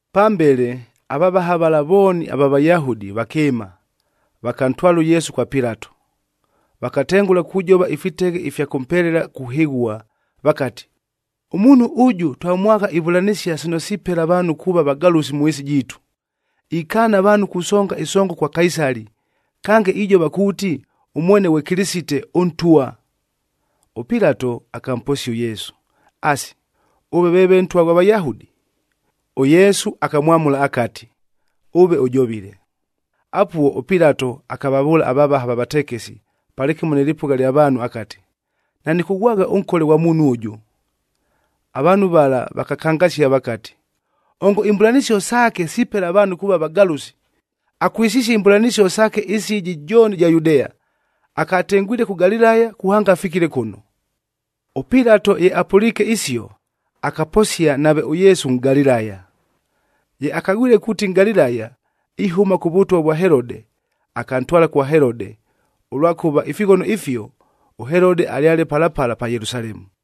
Pambele, avavaha vala vooni ava Vayahudi vakɨɨma, vakantwala ʉYesu kwa Pilato. Vakatengʉla kujova ifiteghe ifya kʉmpelela kuhɨghua, vakati, “Ʉmuunhu ʉjʉ, twamwagha ivʉlanɨsia sino sipela avaanhu kuuva vagalʉsi mʉ ɨɨsi jiitu. Ikaana avaanhu kusonga ɨsongo kwa Kaisali, kange ijova kuuti ʉmwene ghwe Kɨlɨsite, ʉNtwa.” ɄPilato akamposia ʉYesu, “Asi, ʉve veeve Ntwa ghwa Vayahudi?” ɄYesu akamwamʉla akati, “Ʉve ʉjovile.” Apuo, ʉPilato akavavʉʉla avavaha va vatekesi, palɨkɨmo nɨ lɨpʉgha lya vaanhu akati, “Nanɨkʉghwagha ʉnkole kwa muunhu ʉjʉ.” Avaanhu vala, vakakangasia vakati, “Ongo imbʉlanɨsio saake sipela avaanhu kuuva vagalʉsi! Akwɨsisie imbʉlanɨsio saake ɨɨsi ɨjɨ jooni ɨja Yudea, akatengwile kʉ Galilaya kuhanga afikile kʉno.” ɄPilato ye apʉliike isio, akaposia nave ʉYesu Nʼgalilaya. Ye akagwile kuuti Nʼgalilaya, ihʉma kʉ vʉtwa vwa Helode, akantwala kwa Helode, ʉlwakʉva ifighono ifio, ʉHelode alyale pala pala pa Yelusalemu.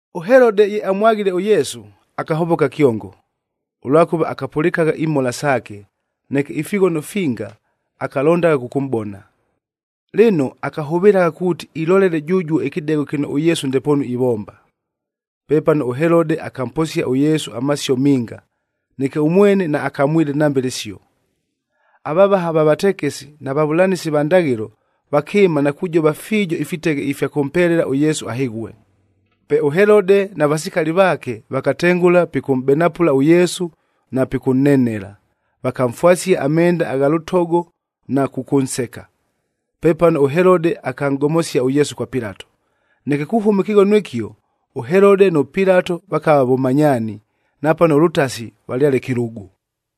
ɄHelode ye amwaghile ʉYesu, akahovoka kyongo, ʉlwakʉva akapʉlɨkagha imhola saake, neke ifighono finga akalondagha kʉkʉmʼbona. Lɨno, akahʉvɨlagha kuuti ilolele jʉjuo ɨkɨdegho kɨno ʉYesu ndepoonu ivomba. Pepano ʉHelode akamposia ʉYesu amasio minga, neke ʉmwene naakamwile nambe lɨsio. Avavaha va vatekesi na vavʉlanɨsi va ndaghɨlo vakɨɨma na kujova fiijo ifiteghe ifya kʉmpelela ʉYesu ahɨghue. Pe ʉHelode na vasikali vaake, vakatengʉla pikʉmʼbenapʉla ʉYesu na pikʉnnenela. Vakamfwasia amenda agha lʉtogo na kʉkʉnseka. Pepano ʉHelode akanʼgomosia ʉYesu kwa Pilato. Neke kuhʉma ɨkɨghono ɨkio, ʉHelode nʉ Pilato vakava vʉmanyaani, napano ʉlʉtasi valyale kɨlʉgʉ.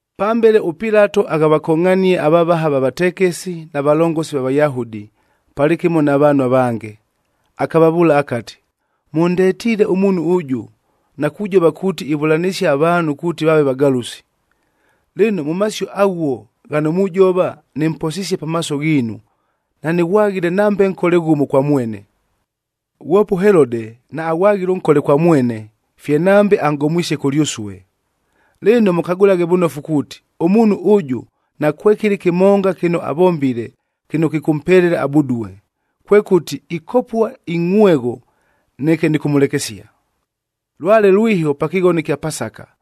Pambele, ʉPilato akavakongʼhania avavaha va vatekesi, na valongosi va Vayahudi, palɨkɨmo na vaanhu avange. Akavavʉʉla akati, “Mʉndetiile ʉmuunhu ʉjʉ, na kujova kuuti ivʉlanɨsia avaanhu kuuti vaave vagalʉsi. Lɨno, mʉ masio aghuo ghano mujova, nɨmposisie pamaaso ghiinu, nanɨghwaghile nambe nkole ghʉmo kwa mwene. Ghwope ʉHelode naaghwaghile ʉnkole kwa mwene, fye nambe anʼgomwisie kʉlyʉsue. Lɨno mʉkagʉlaghe vʉnofu kuuti, ʉmuunhu ʉjʉ, nakwekɨlɨ kɨmonga kɨno avombile, kɨno kɨkʉmpelela abudue. Kwekʉti, ikopua ingʼhwegho, neke nɨkʉmʉlekesia.” Lwale lwiho pa kɨghono ɨkya Pasaka,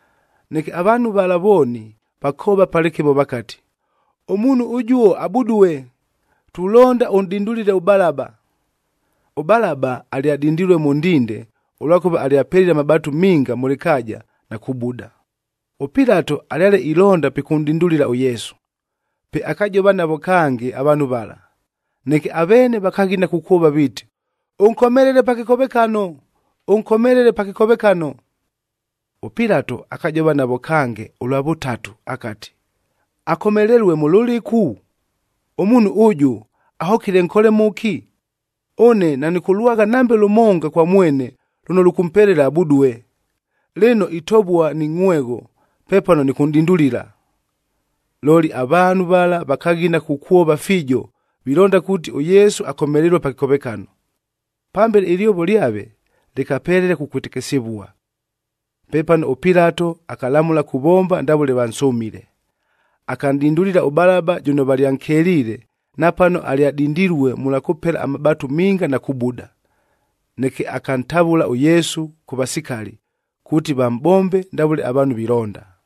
Neke avaanhu vala vooni, vakoova palɨkɨmo vakati, “Ʉmuunhu ʉjuo, abudue! Tulonda ʉnʼdindulile ʉBalaba!” ɄBalaba alyadindilue mʉ ndinde, ʉlwakʉva alyapelile amabaatu minga mʉ lɨkaaja, na kubuda. ɄPilato alyale ilonda pikʉnʼdindulila ʉYesu, pe akajova navo kange avaanhu vala. Neke aveene vakaghina kukwova viiti, “Ʉnkomelele pa kɨkovekano! Ʉnkomelele pa kɨkovekano!” ɄPilato akajova navo kange ʉlwa vʉtatu akati, “Akomelelue mʉ lʉlɨku? Ʉmuunhu ʉjʉ, ahokile nkole mʉki? Ʉne nanɨkʉlwagha nambe lʉmonga kwa mwene lʉno lʉkʉmpelela abudue! Lɨno, itovua ni ngʼhwegho pepano nɨkʉnʼdindulila.” Looli avaanhu vala vakaghina kukwova fiijo, vilonda kuuti ʉYesu akomelelue pa kɨkovekano. Pambele, ɨlyovo lyave lɨkapelela kukwɨtɨkɨsɨvua. Pepano, ʉPilato akalamʉla kuvomba ndavʉle vansʉmile. Akanʼdindulila ʉBalaba jʉno valyankeliile, napano alyadindilue mʉlwa kʉpela amabaatu minga na kubuda. Neke akantavʉla ʉYesu kʉ vasikali, kuuti vamʼbombe ndavʉle avaanhu vilonda.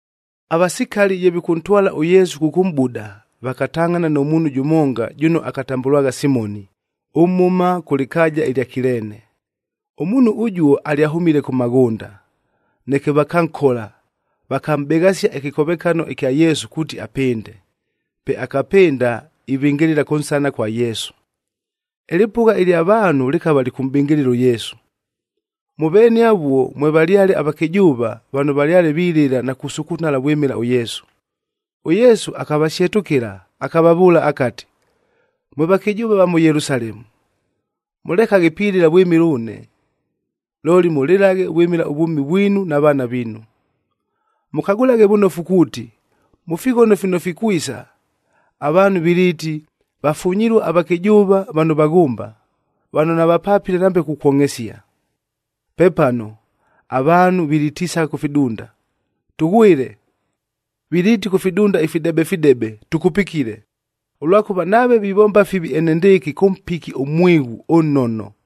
Avasikali ye vikʉntwala ʉYesu kʉkʉmʼbuda, vakatangʼhana nʉ muunhu jʉmonga jʉno akatambʉlwagha Simoni, ʉmhʉma kʉ lɨkaaja ɨlya Kileene. Ʉmuunhu ʉjuo alyahʉmile kʉ maghʉnda. Neke vakankola, vakamʼbeghasia ɨkɨkovekano ɨkya Yesu kuuti apɨnde. Pe akapɨnda ivɨngɨlɨla kʉnsana kwa Yesu. Ɨlɨpʉgha ɨlya vaanhu lɨkava lɨkʉmʼbɨngɨlɨla ʉYesu. Mʉ veene avuo, mwevalyale avakɨjʉʉva, vano valyale vilɨla na kusukunala vwɨmɨla ʉYesu. ɄYesu akavasyetʉkɨla, akavavʉʉla akati, “Mwe vakɨjʉʉva va mʉ Yelusalemu! Mʉlekaghe pilɨla vwɨmɨla ʉne! Looli, mʉlɨlaghe vwɨmɨla ʉvwʉmi vwinu na vaana viinu! Mʉkagʉlaghe vʉnofu kuuti, mʉ fighono fino fikwisa, avaanhu viliiti, ‘Vafunyilue avakɨjʉʉva vano vaghʉmba, vano navapapile nambe kukwongʼhesia!’ Pepano, ‘Avaanhu vilitisagha kʉ fidunda, “Tʉghwɨle!” Viliiti kʉ fidunda ifidebedebe, “Tʉkupikile!”b ’ “Ʉlwakʉva, nave vivomba fivi enendɨɨkɨ, kʉ mpiki ʉmwighu ʉnnono,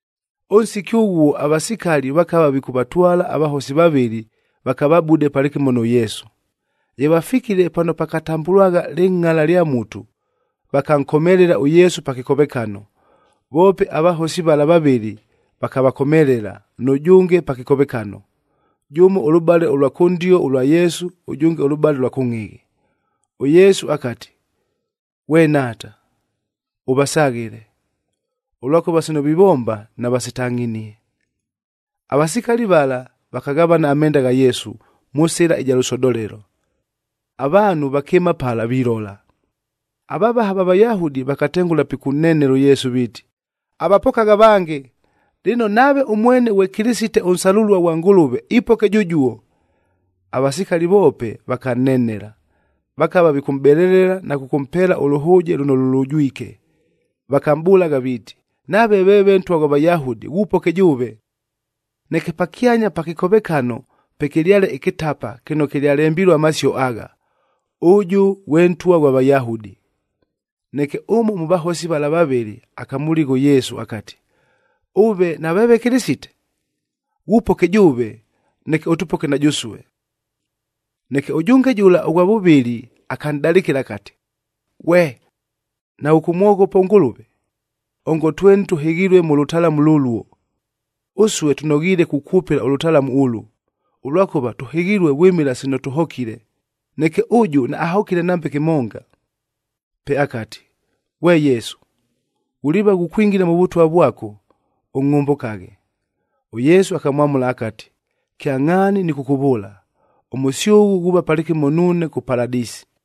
Ʉnsiki ʉghuo, avasikali vakava vikʉvatwala avahosi vavɨlɨ vakavabude palɨkɨmo nʉ Yesu. Ye vafikile pano pakatambʉlwagha Lɨngʼala lya Mutu, vakankomelela ʉYesu pa kɨkovekano. Voope avahosi vala vavɨlɨ vakavakomelela, nʉjʉnge pa kɨkovekano, jʉmo ʉlʉbale ʉlwa kʉndio ʉlwa Yesu, ʉjʉnge ʉlʉbale ʉlwa kʉngʼhɨghɨ. ɄYesu akati, “Ghwe Nhaata! Ʉvasaghɨle! Ʉlwakʉva sino vivomba, navasitangʼhinie.”d Avasikali vala vakaghavana amenda gha Yesu, mʉ sɨla ɨja lʉsodolelo. Avaanhu vakɨɨma pala vilola. Avavaha va Vayahudi vakatengʉla pikʉnnenela ʉYesu viiti, “Avapokagha avange! Lɨno, nave ʉmwene ghwe Kɨlɨsite ʉnsalʉlua ghwa Ngʉlʉve, ipoke jʉjuo!” Avasikali voope, vakannenela. Vakava vikʉmʼbelelela na kʉkʉmpeela ʉlʉhʉʉje lʉno lʉlʉjwike, vakamʼbʉlagha viiti, “Nave veeve Ntwa ghwa Vayahudi, ghupoke jʉʉve!” Neke pakyanya pa kɨkovekano pekɨlyale ɨkɨtapa kɨno kɨlyalembilue amasio agha, “ɄJɄ GHWE NTWA GHWA VAYAHUDI.” Neke ʉmo mʉ vahosi vala vavɨlɨ, akamʉligha ʉYesu akati, “Ʉve naveeve Kɨlɨsite? Ghupoke jʉʉve, neke ʉtʉpoke na jʉsue!” Neke ʉjʉnge jʉla ʉghwa vʉvɨlɨ akanʼdalɨkɨla akati, “Ghwe! Naghʉkʉmwoghopa ʉNgʉlʉve? Ongo tweni tʉhɨghilue mʉ lʉtalamu lʉluo. Ʉsue tʉnoghiile kukwʉpɨla ʉlʉtalamu ʉlʉ, ʉlwakʉva tʉhɨghilue vwɨmɨla sino tʉhokile. Neke ʉjʉ, naahokile nambe kɨmonga.” Pe akati, “Ghwe Yesu! Ghuliiva ghukwingila mʉ Vʉtwa vwako,e ʉngʼhʉmbʉkaghe!” ɄYesu akamwamʉla akati, “Kyangʼhaani nɨkʉkʉvʉʉla, ʉmʉsyʉghʉ ghuuva palɨkɨmo nuune kʉ Paladɨsi.”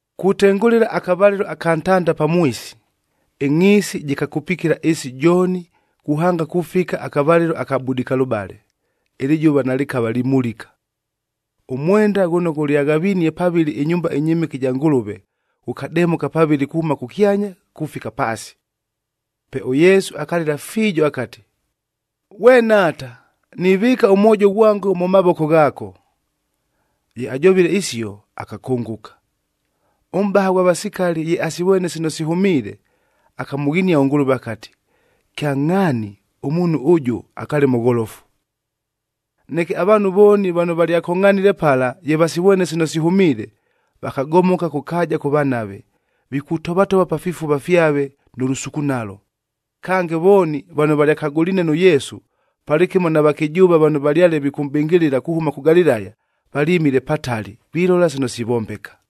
Kutengʉla akavalɨlo aka ntanda pamwisi, ɨngʼhiisi jɨkakupikila ɨɨsi jooni kuhanga kufika akavalɨlo aka budikalʉbale, ɨlɨjʉva nalɨkava limulika. Ʉmwendaf ghʉno ghʉlyaghavinie pavɨlɨ ɨnyumba ɨnyɨmɨke ɨja Ngʉlʉve,g ghʉkademʉka pavɨlɨ kuhʉma kʉkyanya kufika paasi. Pe ʉYesu akalɨla fiijo akati, “Ghwe Nhaata! Nivɨɨka ʉmwojo ghwango mʉ mavoko ghaako.” Ye ajovile isio, akakʉngʉka. Ʉmʼbaha ghwa vasikali ye asivwene sino sihʉmiile, akamʉghinia ʉNgʉlʉve akati, “Kyangʼhaani, ʉmuunhu ʉjʉ akaale mʉgholofu!” Neke avaanhu vooni vano valyakongʼhanile pala, ye vasivwene sino sihʉmiile, vakagomoka kʉ kaaja kʉvanave, vikutovatova pa fifuva fyave nʉ lʉsukunalo. Kange, vooni vano valyakagʉliine nʉ Yesu, palɨkɨmo na vakɨjʉʉva vano valyale vikʉmʼbɨngɨlɨla kuhʉma kʉ Galilaya, valyɨmile patali vilola sino sivombeka.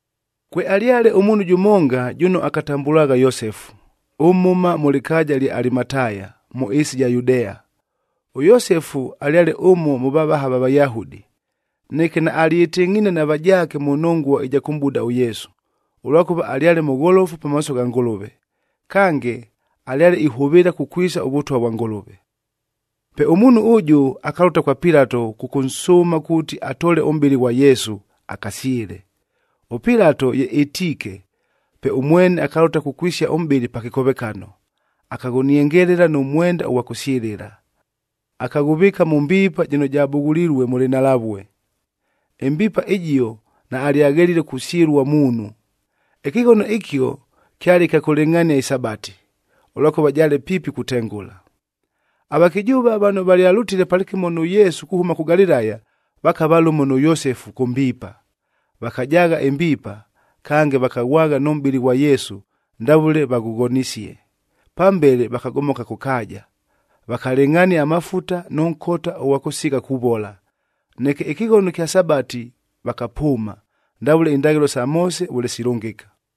Kwealyale ʉmuunhu jʉmonga jʉno akatambʉlwagha Yosefu, ʉmhʉma mʉ lɨkaaja ɨlya Alimataya, mʉ ɨɨsi ɨja Yudea. ɄYosefu alyale ʉmo mʉ vavaha va Vayahudi. Neke naalyɨtɨngʼhiine na vajaake mʉ nongua ɨja kʉmʼbuda ʉYesu, ʉlwakʉva alyale mʉgholofu pamaaso gha Ngʉlʉve. Kange, alyale ihʉvɨɨla kukwisa ʉVʉtwa vwa Ngʉlʉve. Pe ʉmuunhu ʉjʉ akalʉta kwa Pilato kʉkʉnsʉʉma kuuti atoole ʉmʼbɨlɨ ghwa Yesu, akasyɨle. ɄPilato ye ɨtiike, pe ʉmwene akalʉta kukwisia ʉmʼbɨlɨ pa kɨkovekano. Akaghʉniengelela nʉ mwenda ʉghwa kʉsyɨlɨla, akaghʉvɨɨka mʉ mbiipa jɨno jabughulilue mʉ lɨnhalavue. Ɨmbiipa ɨjio, naalyaghelile kusyɨlua muunhu. Ɨkɨghono ɨkio kyale kya kʉlɨngʼhania ɨSabati,h ʉlwakʉva jaale piipi kutengʉla. Avakɨjʉʉva vano valyalʉtile palɨkɨmo nʉ Yesu kuhʉma kʉ Galilaya, vakava lʉmo nʉ Yosefu kʉ mbiipa. Vakajaagha ɨmbiipa, kange vakaghwagha nʉ mʼbɨlɨ ghwa Yesu, ndavʉle vaghʉghonisie. Pambele, vakagomoka kʉ kaaja, vakalɨngʼhania amafuta nʉ nkota ʉghwa kʉsigha kuvola.i Neke ɨkɨghono ɨkya Sabati vakapʉʉma, ndavʉle indaghɨlo sa Moose vʉle silʉngɨka.